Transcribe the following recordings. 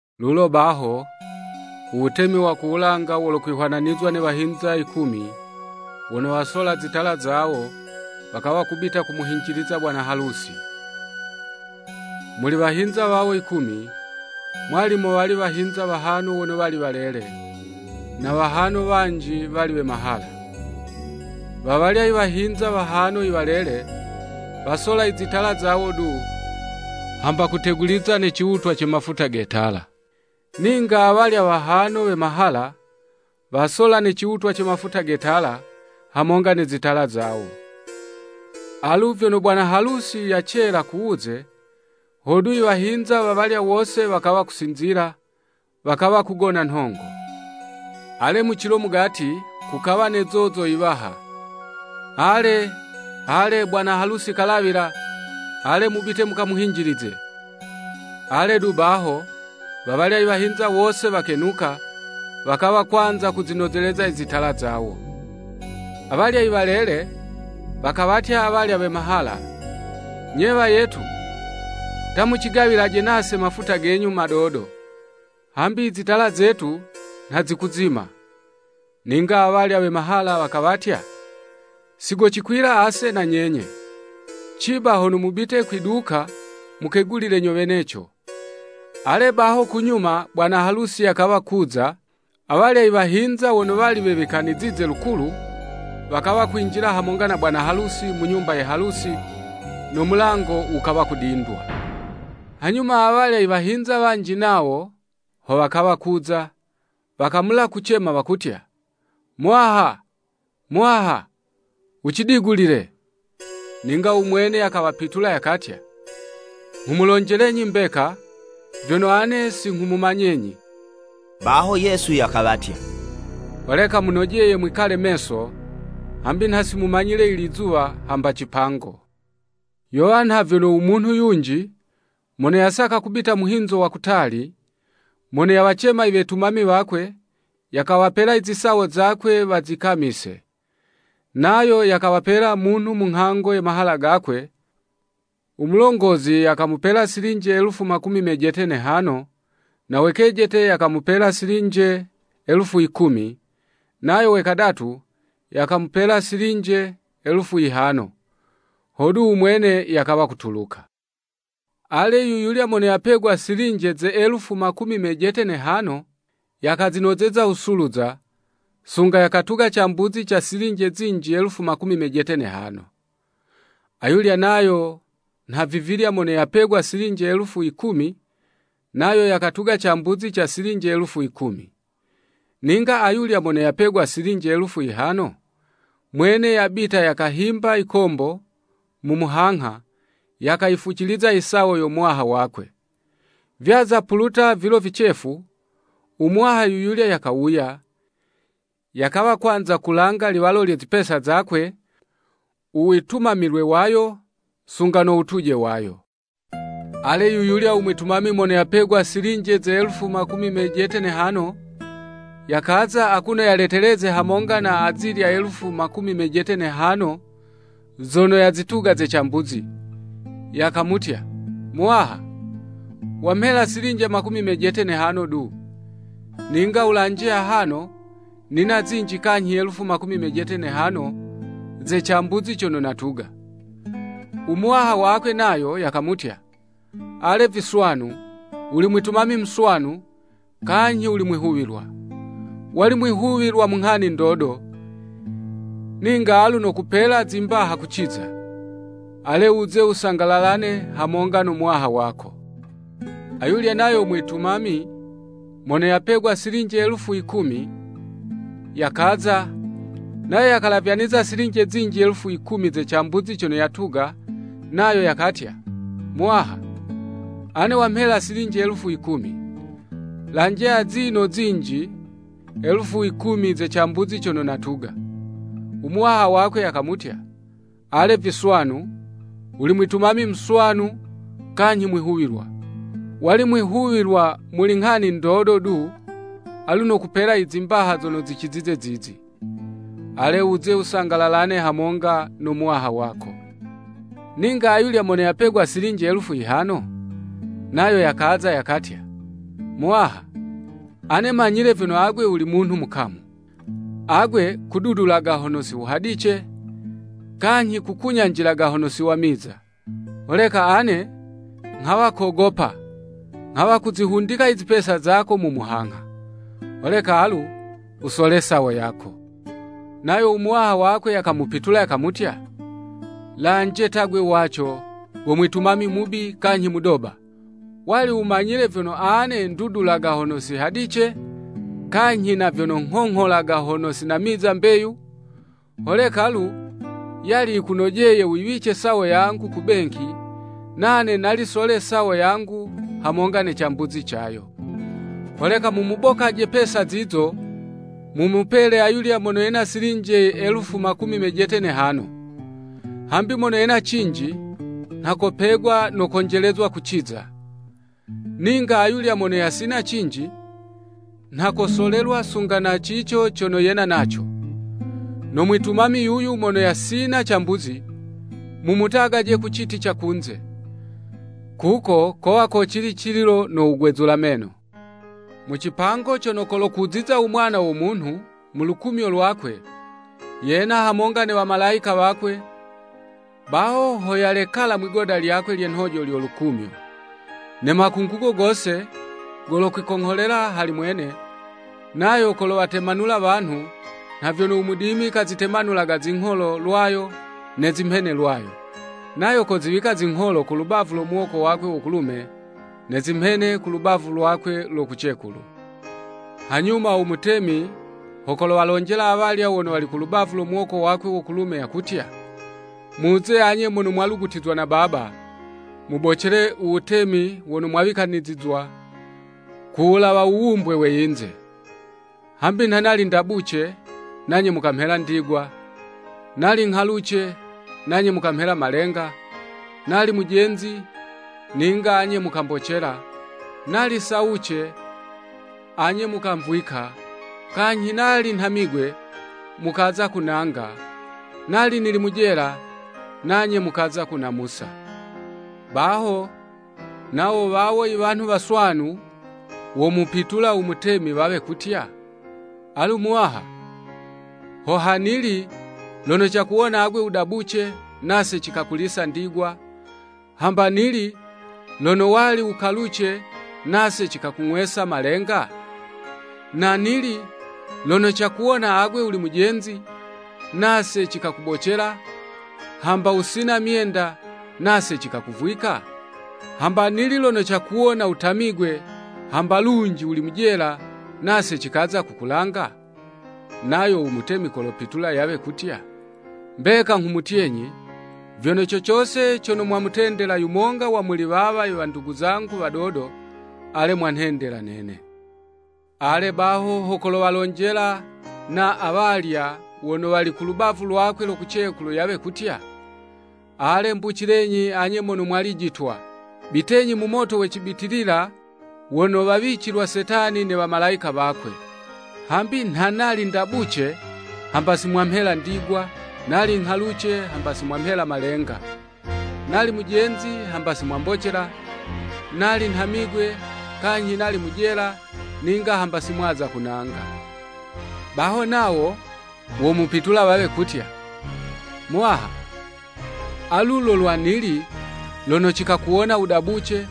“Lulo baho, u Wutemi wa ku wulanga wolokwihwananizwa ne wahinza yikumi, wono wasola zitala zawo, wakawa kubita kumuhinjiliza bwana halusi. Muli wahinza wawo yikumi, mwali mowali wahinza wahano wono wali walele, na wahano wanji, wali we mahala. Wawalya i wahinza wahano iwalele, wasola izitala zawo du, hamba kuteguliza ne ciwutwa ce mafuta ge tala. Ninga awalya wahano we mahala, wasola ne ciwutwa ce mafuta ge tala, hamonga ne zitala zawo. Alu, vyono bwana halusi yacela kuwuze, hodu iwahinza wawalya wose wakawa kusinzila, wakawa kugona nhongo. Ale, mucilo mugati kukawa ne zozo yiwaha, Ale, ale! Bwana halusi kalawila, ale mubite mukamuhinjilize. Ale du baho, wawalya i wahinza wose wakenuka, wakawa kwanza kuzinozeleza i zitala zawo. Awalya iwalele, wakawatya awalya we mahala, ‘Nye wayetu, ta mucigawilaje nase mafuta genyu madodo, hambi izitala zetu nha zikuzima.’ Ninga awalya we mahala, wakawatya, ‘Sigocikwila ase na nyenye! Ciba hono mubite kwi duka mukegulile nyo weneco!’ Ale, baho kunyuma bwana halusi yakawa kuza, awalya i wahinza wono wali wewikanizize lukulu, wakawa kwinjila hamonga na bwana halusi mu nyumba ye halusi, no mulango wukawa kudindwa. Hanyuma awalya i wahinza wanji nawo, ho wakawa kuza, wakamula kucema wakutya, ‘Muwaha, Muwaha, wucidigulile.’ Ninga u mwene yakawapitula yakatya, ‘Nghumulonjelenyi mbeka, vyono ane si nghumumanyenyi.'" Baho Yesu yakawatya, “Holeka munojeye mwikalaje meso, hambi nha si mumanyile ilizuwa hamba cipango.” “Yowa nha vyono u munhu yunji, mono yasaka kubita muhinzo wa kutali, mono yawacema iwetumami wakwe, yakawapela i zisawo zakwe wazikamise. Nayo yakawapela munhu mu nghango ye mahala gakwe, u mulongozi yakamupela silinje elufu makumi mejete ne'hano, na we kejete yakamupela silinje elufu yikumi, nayo we kadatu, yakamupela silinje elufu yihano, hodu u mwene yakawa kutuluka. Ale, yuyulya mono yapegwa silinje ze elufu makumi mejete ne'hano yakazinozeza wusuluza, sunga yakatuga cambuzi ca silinje zinji elufu makumi mejete ne'hano. Ayulya nayo nha vivilya mono yapegwa silinje elufu yikumi, nayo yakatuga cambuzi ca silinje elufu yikumi. Ninga ayulya mono yapegwa silinje elufu yihano, mwene yabita yakahimba yikombo mu muhangha, yakayifuciza i sawo yo muwaha wakwe. “Vyaza kupuluta vilo vicefu, u muwaha yuyulya yakawuya, yakawa kwanza kulanga liwalo lye zipesa zakwe u witumamilwe wayo sunga no wutuje wayo. Ale yuyulya u mwitumami mono yapegwa silinje ze elufu makumi mejete ne'hano, yakaza akuno yaleteleze hamonga na azilya ze elufu makumi mejete ne'hano zono yazituga ze cambuzi, yakamutya, ‘Muwaha, wamhela silinje makumi mejete ne'hano du, ninga wulanje, ahano nina zinji kanyhi elufu makumi mejete ne'hano ze cambuzi cono natuga.’ U Muwaha wakwe nayo yakamutya, ‘Ale viswanu, wuli mwitumami muswanu, kanyhi wuli mwihuwilwa. Wali mwihuwilwa mu nghani ndodo, ninga alu nokupela zimbaha kuciza. Ale wuze wusangalalane hamonga no muwaha wako.’ Ayulya nayo mwitumami mono yapegwa silinje elufu yikumi, yakaza, nayo yakalavyaniza silinje zinji elufu yikumi ze cambuzi cono yatuga nayo, yakatya, ‘Muwaha, ane wamhela silinje elufu yikumi, lanje azino zinji elufu yikumi ze cambuzi cono natuga.’ U Muwaha wakwe yakamutya, ‘Ale viswanu, wuli mwitumami muswanu kanyhi mwihuwilwa. Wali mwihuwilwa muli nghani ndodo du, alu nokupela i zimbaha zono zicizize zizi. Ale wuze wusangalalane hamonga no muwaha wako.’ Ninga ayulya mono yapegwa silinje elufu yihano, nayo yakaza yakatya, ‘Muwaha, ane manyile vyono agwe wuli munhu mukamu, agwe kududulaga hono si wuhadice, kanyhi, kukunyanjilaga hono si wamiza. Holeka ane nghawa kogopa, nghawa kuzihundika i zipesa zako mu muhangha. Holeka alu wusole sawo yako.’ Nayo u Muwaha wakwe yakamupitula yakamutya, ‘Lanje ta 'gwe waco go mwitumami mubi kanyhi mudoba! Wali wumanyile vyono ane ndudulaga hono si hadice, kanyhi na vyono nghongholaga hono si namiza mbeyu. Holeka lu, yali yikunojeye wuyiwice sawo yangu ku benki, nane nali sole sawo yangu hamonga ne cambuzi cayo. Holeka mumubokaje pesa zizo, mumupele ayulya mono yena silinje elufu makumi mejete ne'hano. Hambi mono yena cinji nha kopegwa no konjelezwa kuciza. Ninga ayulya mono yasina cinji, nha kosolelwa sunga na cico cono yena naco. No mwitumami yuyu mono yasina cambuzi, mumutagaje ku citi ca kunze! Kuko kolwa kocili cililo no wugwezula meno.'" “Mu cipango cono kolokuziza u Mwana wo Munhu mu lukumyo lwakwe, yena hamonga ne wamalayika wakwe, baho ho yalekala mwi'goda lyakwe lye nhojo, lyo lukumyo. Ne makungugo gose golokwikongholela hali mwene, nayo kolowatemanula wanhu, nha vyono u mudimi kazitemanulaga zingholo lwayo, ne zimhene lwayo. Nayo koziwika zingholo ku lubavu lo muwoko wakwe wo kulume, ne zimhene ku lubavu lwakwe lo kucekulu. Hanyuma u mutemi ho kowalonjela awalya wono wali ku lubavu lo muwoko wakwe wo kulume yakutya, ‘Muze anye mono mwalugutizwa na Baba, mubocele u Wutemi wono mwawikanizizwa ku wulawa wuwumbwe we yinze. Hambi nha nali ndabuce, nanye mukamhela ndigwa, nali nghaluce, nanye mukamhela malenga, nali mujenzi, ninga anye mukambocela, nali sawuce, anye mukamvwika, kanyhi nali nhamigwe, mukaza kunanga, nali nili mu jela, nanye mukaza kunamusa.’ Baho, nawo wawo iwanhu waswanu, womupitula u mutemi, wawe kutya, ‘Alu Muwaha, ho ha nili, lono cakuwona agwe wudabuce, nase cikakulisa ndigwa, hamba nili lono wali wukaluce nase cikakung'wesa malenga? Na nili lono cakuwona agwe wuli mujenzi, nase cikakubocela, hamba wusina myenda, nase cikakuvwika? Hamba nili lono cakuwona wutamigwe, hamba lunji wuli mu jela, nase cikaza kukulanga?’ Nayo u Mutemi kowapitula yawe kutya, ‘Mbeka nghumutyenyi, vyono co cose cono mwamutendela yumonga wa muli wawa i wandugu zangu wadodo, ale, mwanhendela nene.’ “Ale, baho ho kowalonjela na awalya wono wali ku lubavu lwakwe lo kucekulu yawe kutya, ‘Ale, mbucilenyi anye mono mwalijitwa! Bitenyi mu moto we cibitilila wono wawicilwa Setani ne wamalayika wakwe. Hambi nha nali ndabuce hamba si mwamhela ndigwa, nali nghaluce, hamba si mwamhela malenga. Nali mujenzi, hamba si mwambocela, nali nhamigwe, kanyhi nali mu jela, ninga hamba si mwaza kunanga.’ “Baho nawo womupitula wawe kutya, ‘Muwaha, alu lo lwa nili lono cikakuwona wudabuce,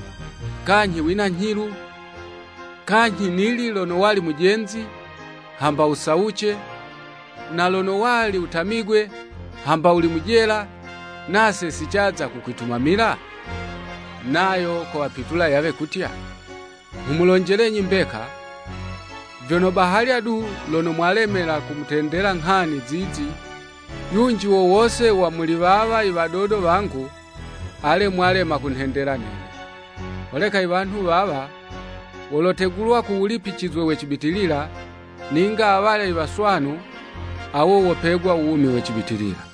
kanyhi wina nyhilu, kanyhi nili lono wali mujenzi hamba wusawuce, na lono wali wutamigwe, hamba wuli mu jela, nase si caza kukwitumamila?’ Nayo kowapitula yawe kutya, ‘Nghumulonjelenyi mbeka, vyono bahalya du lono mwalemela kumutendela nghani zizi yunji wo wose wa muli wawa i wadodo wangu, ale, mwalema kunhendela nene.’ Holeka iwanhu wawa, wolotegulwa ku wulipicizwe we cibitilila, ninga awalya waswanu, awo wopegwa u wumi we cibitilila.”